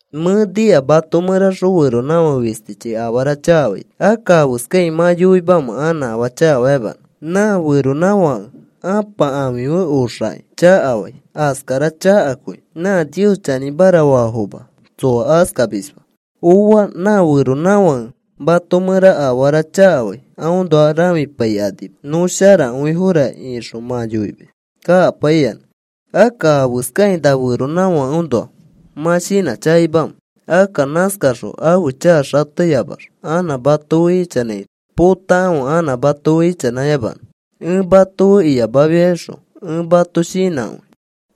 Mẽ nika mato mẽraxõ feronãfake fistichi afara chakafaito. Akka, ¿afeskakĩ mã yoimamẽ anã afaa chakafayamanõ? Nã feronãfake ãpa ãfi fe oxakĩ chakafai. Askara chakakõi. Nã Nios chanĩmara faafoma tsoa askamisma. Ooa. Nã feronãfãke mato mẽraxõ afara chakafai aõnoa rãfipaikanima, “Nõ sharakõifora,” ixõ mã yoimis kakapaiyanã. Akka, ¿afeskakĩ nã feronãfakeõnoa mã shinãchakaimamẽ? Akka nãskaxõ ãfe chaka xateyamax anã mato fe ichanãito potakãfe anã mato fe ichanãyamanõ. Ẽ mato fe iyamafiaxõ ẽ mato shinãkõi.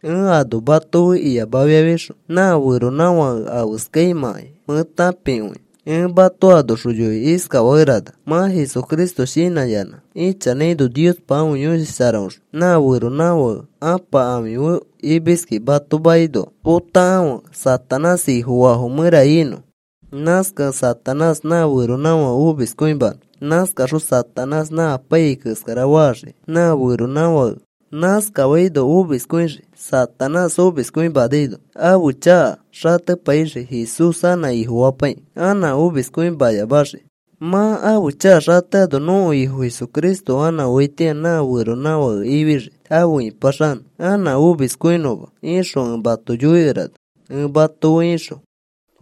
Ẽ ano mato fe iyamafiaxõ nã feronãfake afeskaimãkai mẽ tãpikõia. Ẽ mato anoxõ yoikĩ iskafakerana: “Mã Jesucristo shinãyanã ichanãino Niospa ãfe Yõshi Sharaõxõ nã feronãfake ãpa ãfi fe imiskẽ mato makinoa potakãfe Satanás ifofaafo mẽra inõ. Nãskakẽ Satanás nã feronãfake omiskõimanõ. Nãskaxõ Satanás nã apaiyai keskara faxii nã feronãfake. Nãskafaino omiskõixii. Satanás omiskõimanaino ãfe chaka xatepaixii Jesús anã Ifofapaikĩ anã omiskõiyamaxiki. Mã ãfe chaka xateano nõko Ifo Jesucristo anã oaitĩa nã feronãfake ifixii afe ipaxanõ anã omiskõinõma,” ixõ ẽ mato yoikerana ẽ mato fe ixõ.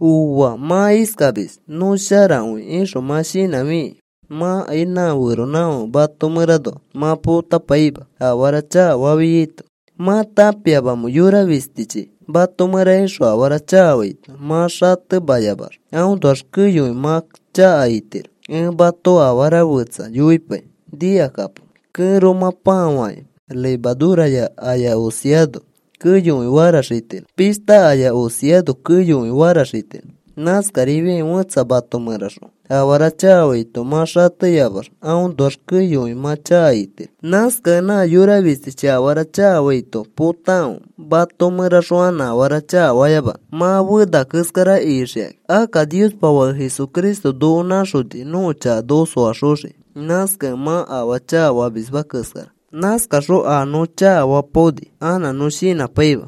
Ooa, mã iskamis: “Nõ sharakõi,” ixõ mã shinãfikĩ mãkai nã feronãfake mato mẽranoa mã potapaima afara chakafafiaito. ¿Mã tãpiamamẽ, yora fistichi mato mẽra ixõ afara chakafaito mã xatemayamax aõnoax keyokõi mã chaka itiro? Ẽ mato afara fetsa yoipai. Nikakapo. Kẽromã pãa fakĩ levadura aya osiano keyokõi faraxitiro. Pishta aya osiano keyokõi faraxitiro. Nãskarifiakĩ fẽtsa mato mẽraxõ afara chakafaito mã xatemayamax aõnoax keyokõi mã chaka itiro. Nãskakẽ nã yora fistichi afara chakafaito potakãfe mato mẽraxõ anã afara chakafayamanõ, mã fena keskara ixikakĩ. Akka Niospa Fake, Jesucristo, noko nãxoni nõko chaka noko soaxoxiki. Nãskakẽ mã afaa chakafamisma keskara. Nãskaxõ a nõ chakafapaoni anã nõ shinãpaima.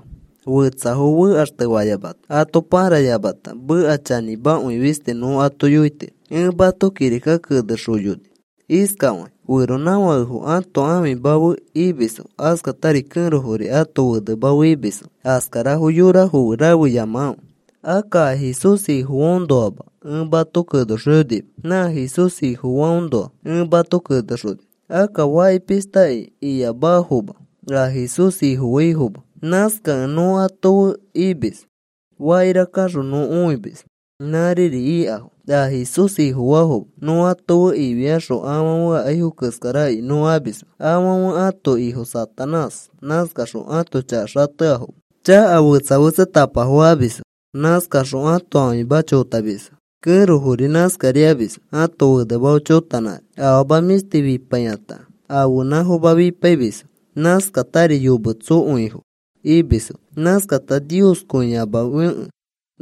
Fetsafo fekaxtefayamata ato pãrayamata meka chanĩmakõi fisti nõ ato yoitiro. Ẽ mato kirika kenexoyoni iskafakĩ: “Feronãfakefo ãto ãfima fe imisfo. Askatari kẽrofori ãto fenema fe imisfo. Askarafo yorafo fe rafeyamakãfe.” Akka a Jesús Ifofaafoõnoama ẽ mato kenexoyonima. Nã Jesús Ifofaifoõnoa ẽ mato kenexoni. Akka faki pishtakai iyamafoma a Jesús Ifofaifoma. Nãskakẽ nõ ato fe imis. Fakira kaxõ nõ õimis nãriri ikafo a Jesús Ifofaafoma. Nõ ato fe ifiaxõ afãfe akaifo keskarakai nõ amisma. Afãfe ãto ifo Satanás. Nãskaxõ ãto chaka xateafoma. Chaka fetsa fetsatapafo amisfo. Nãskaxõ ãto ãfimafo chotamisfo. Kẽrofori nãskarifiamisfo ãto fenema fe chotanãkani. Afama mĩshti fipaikata ãfenãfoma fipaimisfo. Nãskatari yometsokõifo imisfo. Nãskakata nioskõiyamafekẽ,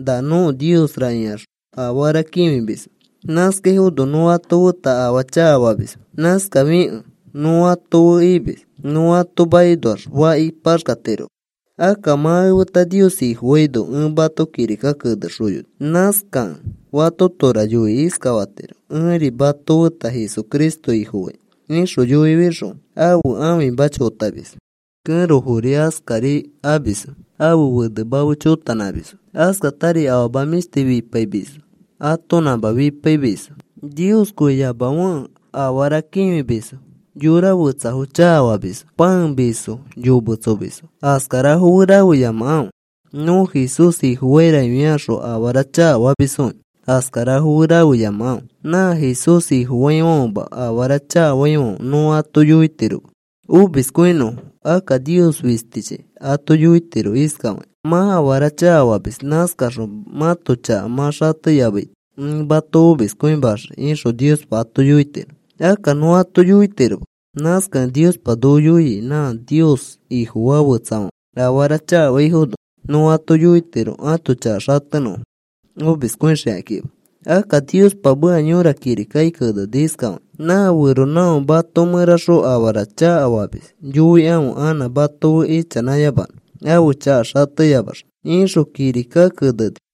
“Na nõko niosra,” ikaxõ afara kĩfimisfo. Nãskafaifono nõ ato feta afaa chakafamisma. Nãskafikẽ nõ ato fe imis. Nõ ato makinoax faki paxkatiroma. Akka mã efeta Nios Ifofaino ẽ mato kirika kenexoyoni. Nãskakẽ fatotora yoikĩ iskafatiro: “Ẽri mato feta Jesucristo Ifofai,” ixõ yoifixõ ãfe ãfima chotamis. Kẽrofori askari amisfo ãfe fenema fe chotanãmisfo. Askatari afama mĩshti fichipaimisfo. Atonãma fipaimisfo. Nioskõiyamafekẽ afara kĩfimisfo. Yora fetsafo chakafamisfo. Pãemisfo. Yometsomisfo. Askarafo fe rafeyamakãfe. “Nõ Jesús Ifofaira,” ifiakaxõ afara chakafamisfokĩ. Askarafo fe rafeyamakãfe. Nã Jesús Ifofaifãfema afara chakafaifãfe nõ ato yoitiroma omiskõinõfo. Akka Nios fistichi ato yoitiro iskafakĩ: “Mã afara chakafamis. Nãskaxõ mãto chaka mã xateyamaito ẽ mato omiskõimaxii,” ixõ Niospa ato yoitiro. Akka nõ ato yoitiroma. Nãskakẽ Niospa noko yoia nã Nios Ifofaa fetsafãfe afara chakafaifono nõ ato yoitiro ãto chaka xatenõfo omiskõixikakima. Akka Niospa meka yõra kirikaki keneni iskafakĩ: “Nã feronãfãke mato mẽraxõ afara chakafamis yoikãfe anã mato fe ichanãyamanõ ãfe chaka xateyamax,” ixõ kirika keneni.